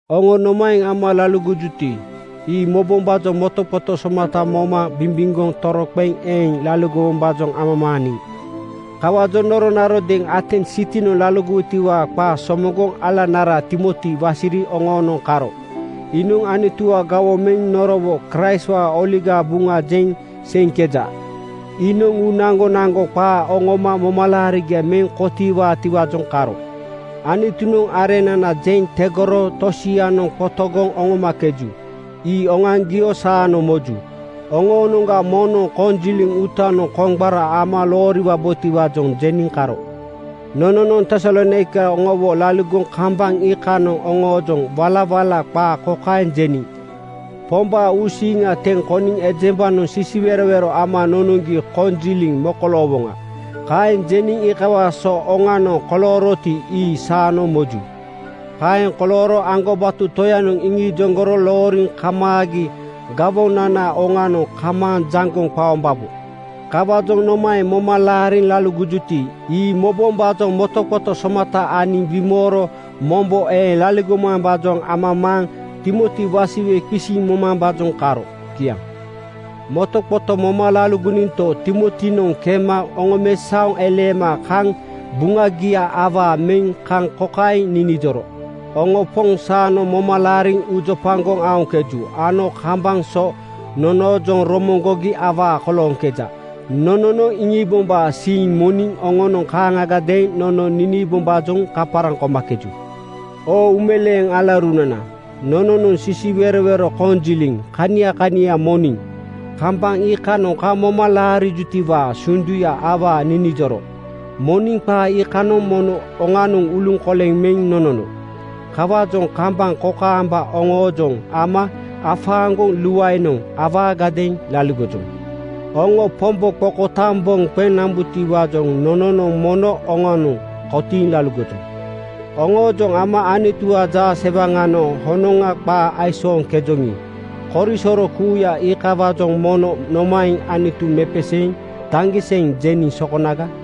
Oŋo nomaeŋ ama laligojuti, ii mobombaa motoqoto somata moma bimbimgoŋ toroqeŋ eeŋ laligowombaajoŋ amamaaniŋ. Kawaajoŋ noronarodeeŋ Atens sitinoŋ laligowotiwaa qaa somoŋgoŋ alanara Timoti wasiri oŋoonoŋ karo. Iinoŋ Anutuwaa gawoŋ meŋ norowo Kraistwaa Oligaa Buŋa jeŋ seiŋkeja. Iinoŋ uu naŋgonaŋgo qaa oŋoma momalaarigia meŋ kotiiwaatiwaajoŋ karo. Anutunoŋ areŋnana jeŋ tegoro tosianoŋ qotogoŋ oŋomakeju, ii oŋoaŋgio saanoŋ moju. Oŋoonoŋga moŋnoŋ konjiliŋ uutanoŋ koŋgbara ama looriwabotiwaajoŋ jeniŋ karo. Nononoŋ Tesalonaika oŋowo laligoŋ kambaŋ iikanoŋ oŋoojoŋ walawala qaa kokaeŋ jeniŋ, “Pombaa uusiiŋa teŋ koniŋ ejembanoŋ sisiwerowero ama nonoŋgi konjiliŋ mokoloowoŋa.” Kaeŋ jeniŋ iikawaa so oŋanoŋ kolooroti, ii saanoŋ moju. Kaeŋ kolooro aŋgobato Toyanoŋ iŋijoŋgoro looriŋ kamaagi gawonanaa oŋanoŋ kamaaŋ jaŋgoŋ qaombabo. Kawaajoŋ nomaeŋ moma laariŋ laligojuti, ii mobombaajoŋ motoqoto somata aniŋ bimooro mombo eeŋ laligomambaajoŋ amamaaŋ Timoti wasiwe qisiŋ momambaajoŋ karo. Kiaŋ. Motoqoto moma laligoninto, Timotinoŋ kema oŋomesaoŋ eleema kaŋ buŋagia awaa meŋ kaŋ kokaeŋ ninijoro: Oŋo Poŋ saanoŋ moma laariŋ uujopagoŋ aoŋkeju ano kambaŋ so nonoojoŋ romoŋgogi awaa kolooŋkeja. Nononoŋ iŋiibombaa siiŋ moniŋ oŋonoŋ kaaŋagadeeŋ nono niniibombaajoŋ kaparaŋ komakeju. Oo uumeleeŋ alaurunana, nononoŋ sisiwerowero koŋajiliŋ kania kania moniŋ kambaŋ iikanoŋ kaŋ moma laarijutiwaa sunduya awaa ninijoro moniŋ qaa iikanoŋ mono oŋanoŋ uluŋkoleŋ meŋ nonono. Kawaajoŋ kambaŋ kokaamba oŋoojoŋ ama afaaŋgoŋ luaenoŋ awaagadeeŋ laligojoŋ. Oŋo Pombo qokotaaŋ boŋ qeŋ nambutiwaajoŋ nononoŋ mono oŋanoŋ kotiiŋ laligojoŋ. Oŋoojoŋ ama Anutuwaa jaasewaŋanoŋ honoŋa qaa aisooŋkejoŋi, korisoro kuuya iikawaajoŋ mono nomaeŋ Anutu mepeseeŋ daŋgiseŋ jeniŋ sokonaga?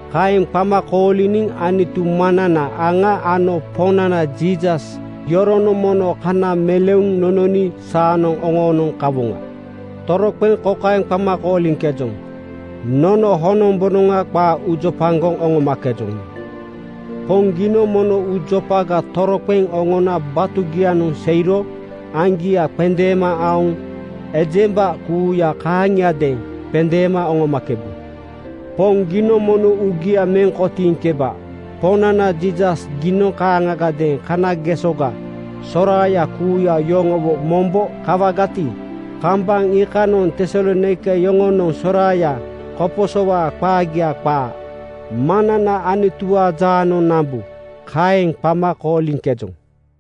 Kaeŋ qama kooliniŋ Anutu Maŋnana aŋa ano Poŋnana Jiisas yoronoŋ mono kana meleuŋ nononi saanoŋ oŋoonoŋ kawoŋa. Toroqeŋ kokaeŋ qama kooliŋkejoŋ, ‘Nono honombonoŋa qaa uujopagoŋ oŋomakejoŋi, Poŋ giinoŋ mono uujopaga toroqeŋ oŋona batugianoŋ seiro aŋgia qendeema aoŋ ejemba kuuya kaaŋiadeeŋ qendeema oŋomakebu. Poŋ, giinoŋ mono uugia meŋ kotiiŋkeba. Poŋnana Jiisas giinoŋ kanageŋ kanagesoga soraaya kuuya yoŋowo mombo kawagati, kambaŋ iikanoŋ Tesalonaika yoŋonoŋ soraaya koposowaa qaagia qaa Maŋnana Anutuwaa jaanoŋ nambu.’ Kaeŋ qama kooliŋkejoŋ.